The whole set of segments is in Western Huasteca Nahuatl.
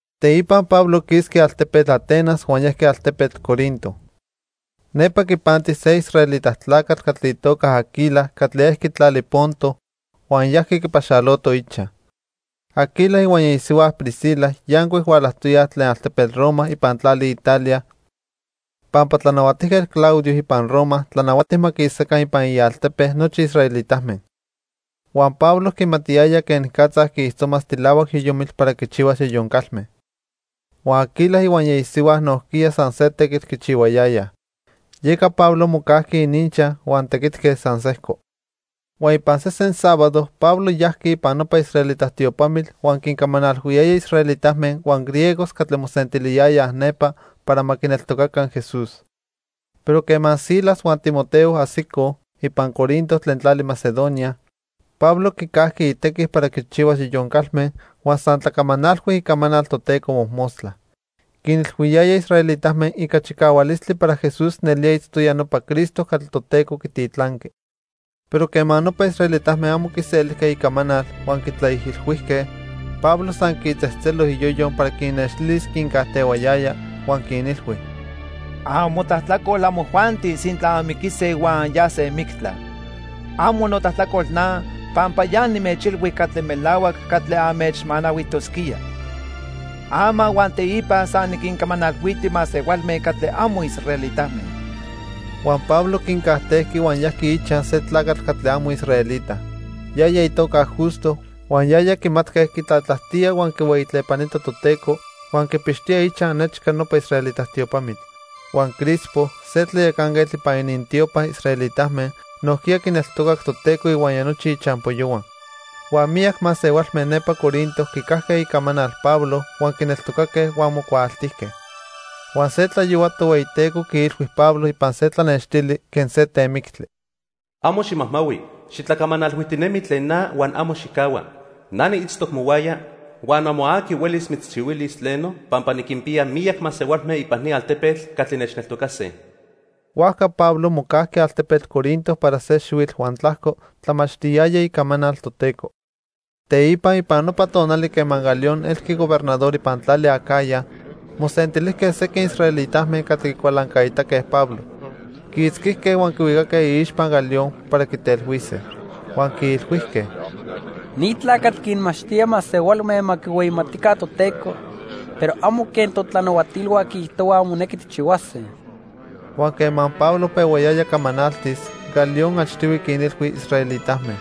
Teipa Pablo quisqui altepetl Atenas huan yajqui altepetl Corinto. Nepa quipanti se israelita tlacatl catli itoca Aquila catli ejqui tlali Ponto huan yajqui quipaxaloto ichaj. Aquila ihuaya isihua Priscila yancuic hualajtoyaj tlen altepetl Roma ipan tlali Italia pampa Tlanahuatijquetl Claudio ipan Roma tlanahuati ma quisaca ipan ialtepe nochi israelitame. Huan Pablo quimatiyaya quenicatza quiijtzomas tilahuac yoyomitl para quichihuas yoyon calme. Huan Aquila ihuaya isihua nojquiya san se tequitl quichihuayayaj. Yeca Pablo mocajqui ininchaj huan tequitque san sejco. Huan ipan sesen sábado Pablo yajqui ipan nopa israelita tiopamitl huan quincamanalhuiyaya israelitame huan griegos catli mosentiliyayaj nepa para ma quineltocaca Jesús. Pero quema Silas huan Timoteo ajsicoj ipan Corinto tlen tlali Macedonia, Pablo quicajqui itequi para quichihuas yoyon calme huan san tlacamanalhui icamanal Toteco mojmostla. Quinilhuiyaya israelitame ica chicahualistli para Jesús nelía itztoya nopa Cristo catli Toteco quititlanqui. Pero quema nopa israelitame amo quiselijque icamanal huan quitlaijilhuijque, Pablo san quitzejtzelo iyoyo para quinnextilis quincajtehuayaya, huan quinilhui: —Amotlajtlacol amojuanti sintla anmiquise huan anyase mictla. Amo notlajtlacol na, pampa ya nimechilhui catli melahuac catli anmechmanahuijtosquía. Ama huan teipa san niquincamanalhuiti masehualme catli amo israelitame. Huan Pablo quincajtejqui huan yajqui ichaj se tlacatl catli amo israelita. Yaya itoca Justo huan yaya quimatque quitlatlajtía huan quihueyitlepanita Toteco huan quipixtoya ichaj nechca nopa israelita tiopamitl. Huan Crispo, se tlayacanquetl ipan inintiopa israelitame, nojquiya quineltocac Toteco ihuaya nochi ichampoyohua. Huan miyac masehualme nepa Corinto quicajque icamanal Pablo huan quineltocaque huan mocuaaltijque. Huan se tlayohua Tohueyiteco quiilhui Pablo ipan se tlanextili quen se temictli: "Amo ximajmahui. Xitlacamanalhuijtinemi tlen na huan amo xijcahua. Na niitztoc mohuaya, huan amo aqui huelis mitzchihuilis tleno, pampa niquinpiya miyac masehualme ipan ni altepetl catli nechneltocase." Huajca Pablo mocajqui altepetl Corinto para se xihuitl huan tlajco tlamachtiyaya icamanal Toteco. Teipa ipan nopa tonali quema Galión elqui gobernador ipan tlali Acaya, mosentilijque sequin israelitame catli quicualancaitaque Pablo. Quiitzquijque huan quihuicaque iixpa Galión para quitelhuise. Huan quiilhuijque: —Ni tlacatl quinmachtía masehualme ma quihueyimatica Toteco, pero amo quen totlanahuatilhua quiijtohuaj monequi tijchihuase. Huan quema Pablo pehuayaya camanaltis, Galión achtihui quinilhui israelitame: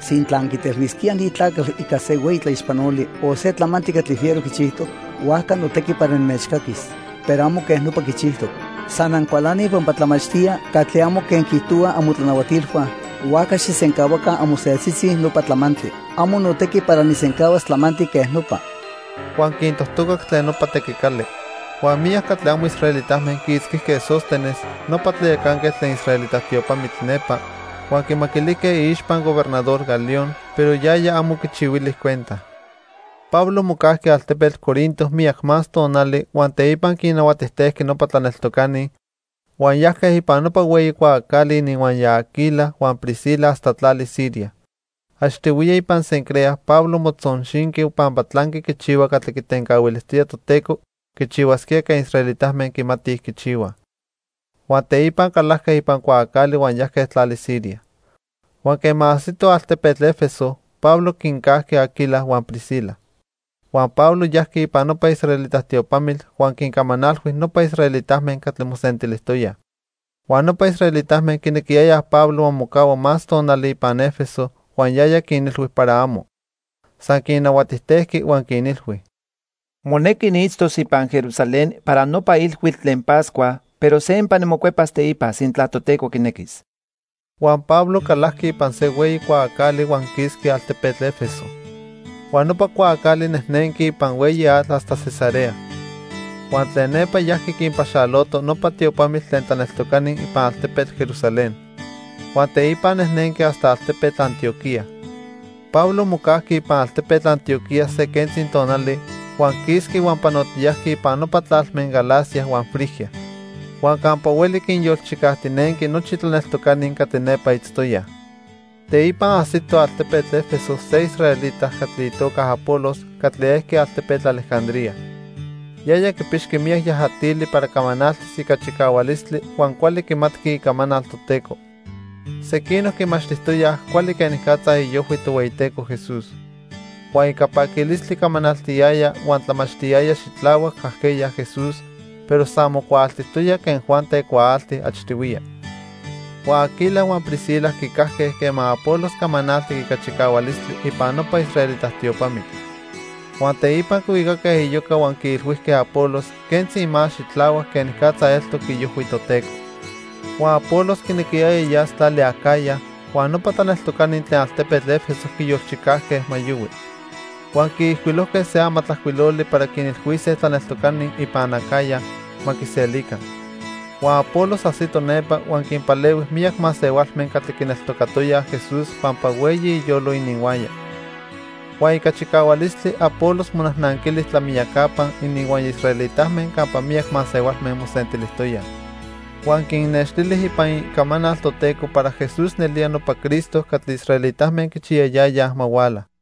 —Sintla anquitelhuisquíaj ni tlacatl ica se hueyi tlaixpanoli o se tlamantli catli fiero quichijtoc, huajca notequi para nimechcaquis. Pero amo quej nopa quichijtoc. San ancualanij pampa tlamachtía catli amo quen quiijtohuaj amotlanahuatilhua, huajca xijsencahuaca amoseltzitzi nopa tlamantli. Amo notequi para nijsencahuas tlamantli quej nopa. Huan quintojtocac tlen nopa tequicali. Huan miyac catli amo israelitame quiitzquijque Sóstenes, nopa tlayacanquetl tlen israelita tiopamitl nepa, huan quimaquilijque iixpa Gobernador Galión, pero yaya amo quichihuili cuenta. Pablo mocajqui altepetl Corinto miyac más tonali huan teipa quinnahuatijtejqui nopa tlaneltocani, huan yajque ipan nopa hueyi cuaacali ininhuaya Aquila huan Priscila hasta tlali Siria. (Achtihuiya ipan Cencrea Pablo motzonxinqui pampa tlanqui quichihua catli quitencahuilijtoya Toteco quichihuasquía quen israelitame quimatij quichihuaj.) Huan teipa calajque ipan cuaacali huan yajque tlali Siria. Huan quema ajsitoj altepetl 'Efeso, Pablo quincajqui Aquila huan Priscila. Huan Pablo yajqui ipan nopa israelita tiopamitl huan quincamanalhui nopa israelitame catli mosentilijtoyaj. Huan nopa israelitame quinequiyayaj Pablo ma mocahua más tonali ipan 'Efeso huan yaya quinilhui para amo. San quinnahuatijtejqui huan quinilhui: "Monequi niitztos ipan Jerusalén para nopa ilhuitl tlen Pascua, pero sempa nimocuepas teipa sintla Toteco quinequis." Huan Pablo calajqui ipan se hueyi cuaacali huan quisqui altepetl 'Efeso. Huan nopa cuaacali nejnenqui ipan hueyi atl hasta Cesarea. Huan tlen nepa yajqui quinpaxalotoj nopa tiopamitl tlen tlaneltocani ipan altepetl Jerusalén. Huan teipa nejnenqui hasta altepetl Antioquía. Pablo mocajqui ipan altepetl Antioquía se quentzi tonali huan quisqui huan panotiyajqui ipan nopa tlalme Galacia huan Frigia. Huan campa hueli quinyolchicajtinenqui nochi tlaneltocani catli nepa itztoyaj. Teipa ajsito altepetl 'Efeso se israelita catli itoca Apolos catli ejqui altepetl Alejandría. Yaya quipixqui miyac yajatili para camanaltis ica chicahualistli huan cuali quimatqui Icamanal Toteco. Sequinoc quimachtijtoyaj cuali quenicatza iojhui Tohueyiteco Jesús. Huan ica paquilistli camanaltiyaya huan tlamachtiyaya xitlahuac ajqueya Jesús, pero san mocuaaltijtoya quen Juan tecuaalti achtihuiya. Huan Aquila huan Priscila quicajque quema Apolos camanaltic ica chicahualistli ipan nopa israelita tiopamitl. Huan teipa quihuicaque iyoca huan quiilhuijque Apolos quentzi más xitlahuac quenicatza eltoc iojhui Toteco. Huan Apolos quinequiyaya yas tlali Acaya, huan nopa tlaneltocani tlen altepetl 'Efeso quiyolchicajque ma yohui. Huan quiijcuilojque se amatlajcuiloli para quinilhuise tlaneltocani ipan Acaya ma quiselica. Huan Apolos ajsito nepa huan quinpalehui miyac masehualme catli quineltocatoyaj Jesús pampa hueyi iyolo ininhuaya. Huan ica chicahualistli Apolos monajnanquili tlamiyacapa ininhuaya israelitame campa miyac masehualme mosentilijtoyaj. Huan quinnextili ipan Icamanal Toteco para Jesús nelía nopa Cristo catli israelitame quichiyayayaj ma huala.